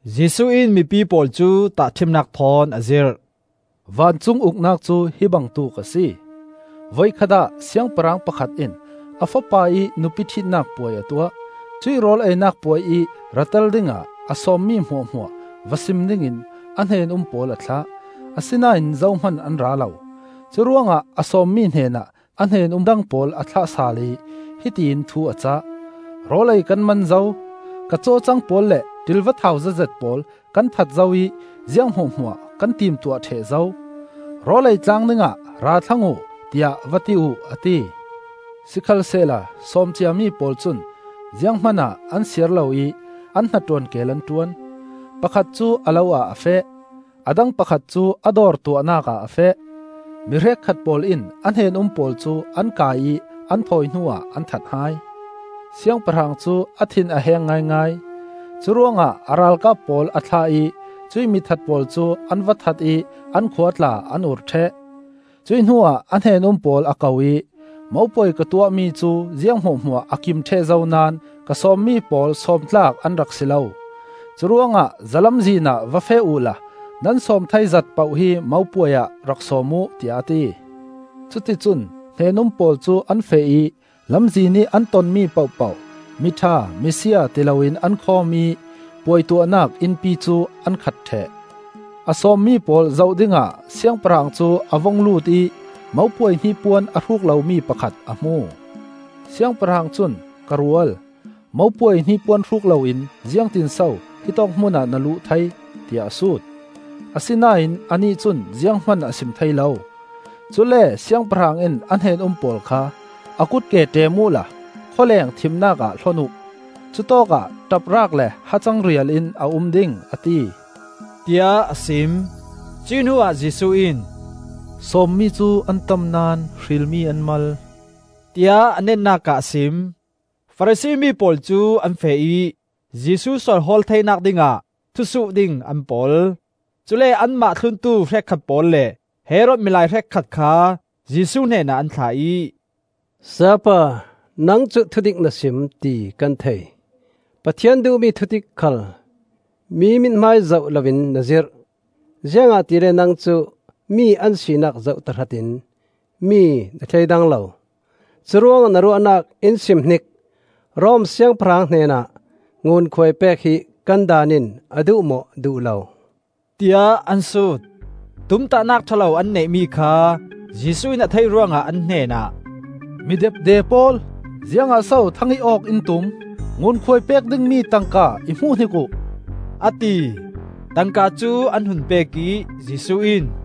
Jesuh in mipi pawl cu tahṭhimnak thawn a zirh. “Vancung Uknak cu hi bangtuk a si. Voikhat ah siangpahrang pakhat in a fapa ih nupi ṭhitnak puai a tuah. Cuih rawl einak puai ih ra tel dingah a sawmmi hmuahhmuah va sim dingin a hnen-um pawl a thlah; asinain zohman an ra lo. Curuangah a sawmmi hnenah a hnen-um dang pawl a thlah sal ih hiti in thu a cah. ‘Rawl ei kan man zo. Ka cawcang pawl le ṭilva thau zetzet pawl kan that zo ih ziang hmuahhmuah kan timtuah ṭheh zo. Rawl ei tlang dingah ra thlang uh, tiah va ti uh,’ a ti. Sikhalsehla sawm ciami pawl cun zianghman ah an siar lo ih an hnaṭuan keel an ṭuan; pakhat cu a lo ah a feh, a dang pakhat cu a dawr tuahnak ah a feh; mi hrekkhat pawl in a hnen-um pawl cu an kai ih an thawi hnuah an that hai. Siangpahrang cu a thin a heng ngaingai. Curuangah a ralkap pawl a thlah ih cuih mithat pawl cu an va that ih an khua tla an ur ṭheh. Cuih hnuah a hnen-um pawl a ko ih, ‘Mopuai ka tuahmi cu ziang hmuahhmuah a kim ṭheh zo naón ka sawmmi pawl sawmtlak an rak si lo. Curuangah zalamzin ah va feh uhla nan sawm thei zat poh hi mopuai ah rak sawm uh,’ tiah a ti. Cuticun hnen-um pawl cu an feh ih lamzinih an tonmi pohpoh miṭha misia ti loin an khawm ih puai tuahnak innpi cu an khat ṭheh. “A sawmmi pawl zoh dingah siangpahrang cu a vung lut ih mopuai hnipuan a hruk lomi pakhat a hmu. Siangpahrang cun, ‘Ka rual, mopuai hnipuan hruk loin ziangtinso hitawk hmunah na luh thei,’ tiah a sut. Asinain anih cun zianghman a sim thei lo. Cule Siangpahrang in a hnen-um pawl kha, ‘A kutke ṭem uhla khawleng thimnak ah hlon uh. Cutawkah ṭap raak le hacang rial in a um ding,’ a ti,” tiah a sim. Cuih hnuah Jesuh in, “Sawmmi cu an tam naón hrilmi an mal,” tiah a netnak ah a sim. Farasi mi pawl cu an feh ih Jesuh sual hawl theinak dingah thu suh ding an pol. Cule anmah thluntu hrekkhat pawl le Herod milai hrekkhat kha Jesuh hnenah an thlah ih, “Sayapa, nang cu thudik na sim, ti kan thei. Pathian duhmi thudik khal mi mithmai zoh loin na zirh. Ziangahtile nang cu mi an sinak zoh tahratin mi na thleidang lo. Curuangah na ruahnak in sim hnik. Rom Siangpahrang hnenah ngunkhuai pek hi kan Daan in a duh maw duh lo,” tiah an sut. Tumtahnak ṭha lo an neihmi kha Jesuh in a theih ruangah an hnenah, “Mi depde pawl! Ziangah so thang ih awk in tum? Ngunkhuai pek dingmi tangka i hmuhhnik uh,” a ti. Tangka cu an hun pek ih Jesuh in,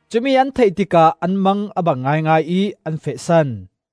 Cumi an theih tikah an mang a bang ngaingai ih an fehsan.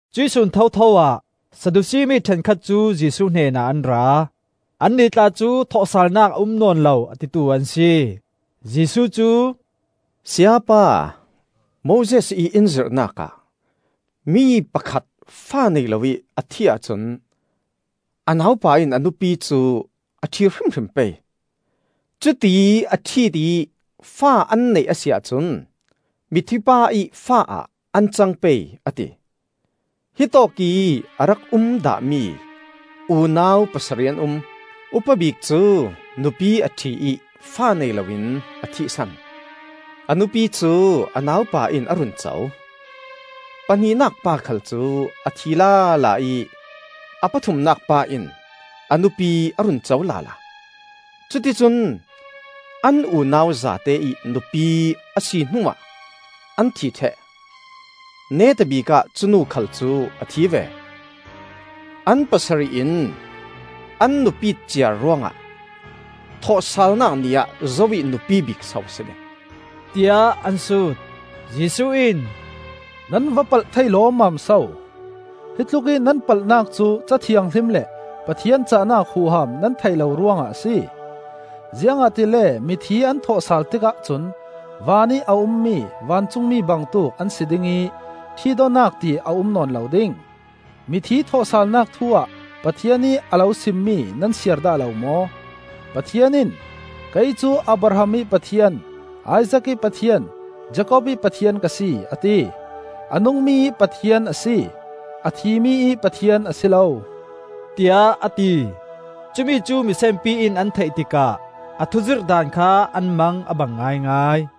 Cuih sun thotho ah Saddusi mi ṭhenkhat cu Jesuh hnenah an ra. Annih tla cu thawhsalnak a um nawn lo, a titu an si. Jesuh cu, “Sayapa, Moses ih in zirhnak ah, ‘Mi pakhat fa nei loih a thih ahcun a naupa in a nupi cu a ṭhi hrimhrim pei. Cuti a ṭhit ih fa an neih a si ahcun mithi pa ih fa ah an cang pei,’ a ti. Hitawkih a rak um dahmi unau pasarih an um. Upa bik cu nupi a ṭhi ih fa nei loin a thihsan; a nupi cu a naupa in a run co. Pahnihnak pa khal cu a thi lala ih a pathumnak pa in a nupi a run co lala. Cuticun an unau zate ih nupi a si hnuah an thi ṭheh. Neta bikah cu nu khal cu a thi ve. An pasarih in an nupit ciar ruangah thawhsalnak ni ah zo ih nupi bik so a si ding?” tiah an sut. Jesuh in, “Nan va palh thei lawmmam so! Hi tlukih nan palhnak cu Ca Thianghlim le Pathian cahnak huham nan theih lo ruangah a si. Ziangahtile mithi an thawhsal tikah cun vanih a ummi vancungmi bangtuk an si ding ih ṭhitawknak ti a um nawn lo ding. Mithi thawhsalnak thu-ah Pathian ih a lo simmi nan siar dah lo maw? Pathian in, ‘Kei cu Abraham ih Pathian, Isaak ih Pathian, Jakob ih Pathian ka si,’ a ti. A nungmi ih Pathian a si, a thimi ih Pathian a si lo,” tiah a ti. Cumi cu misenpi in an theih tikah a thuzirh daan kha an mang a bang ngaingai.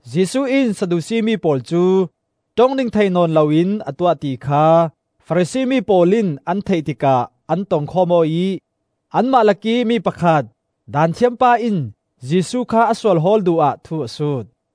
Jesuh in Saddusi mi pawl cu ṭong ding thei nawn loin a tuah ti kha Farasi mi pawl in an theih tikah an tong khawm aw ih, anmah lakih mi pakhat, Daanthiam pa in Jesuh kha a sual hawl duh ah thu a sut.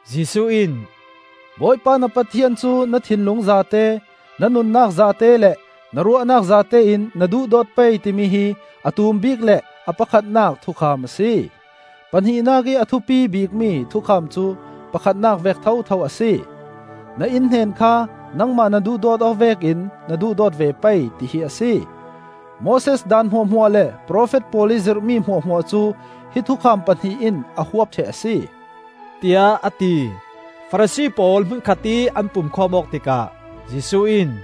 Jesuh in, “‘Bawipa na Pathian cu na thinlung zate, na nunnak zate le na ruahnak zate in na duhdawt pei,’ timi hi a tum bik le a pakhatnak thukham a si. Pahnihnak ih a thupi bikmi thukham cu pakhatnak vek thotho a si: ‘Na innhnen kha nangmah na duhdawt awk vekin na duhdawt ve pei,’ ti hi a si. Moses Daan hmuahhmuah le profet pawl ih zirhmi hmuahhmuah cu hi thukham pahnih in a huap ṭheh a si,” tiah a ti. Farasi pawl hmun khatih an pumkhawm awk tikah Jesuh in,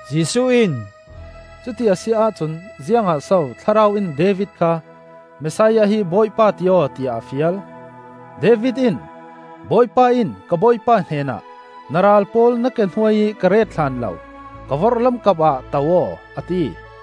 Jesuh in, “Cuti a si ahcun ziangah so Thlarau in David kha, ‘Messiah hi Bawipa ti aw,’ tiah a fial? David in: “Bawipa in ka Bawipa hnenah, Na ral pawl na ke hnuai ih ka ret hlan lo, Ka vorhlam kapah to aw,’ a ti.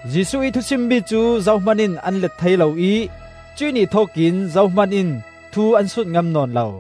Jesuh ih thusuhmi cu zohman in an let thei lo ih cuih ni thokin zohman in thu an sut ngam nawn lo.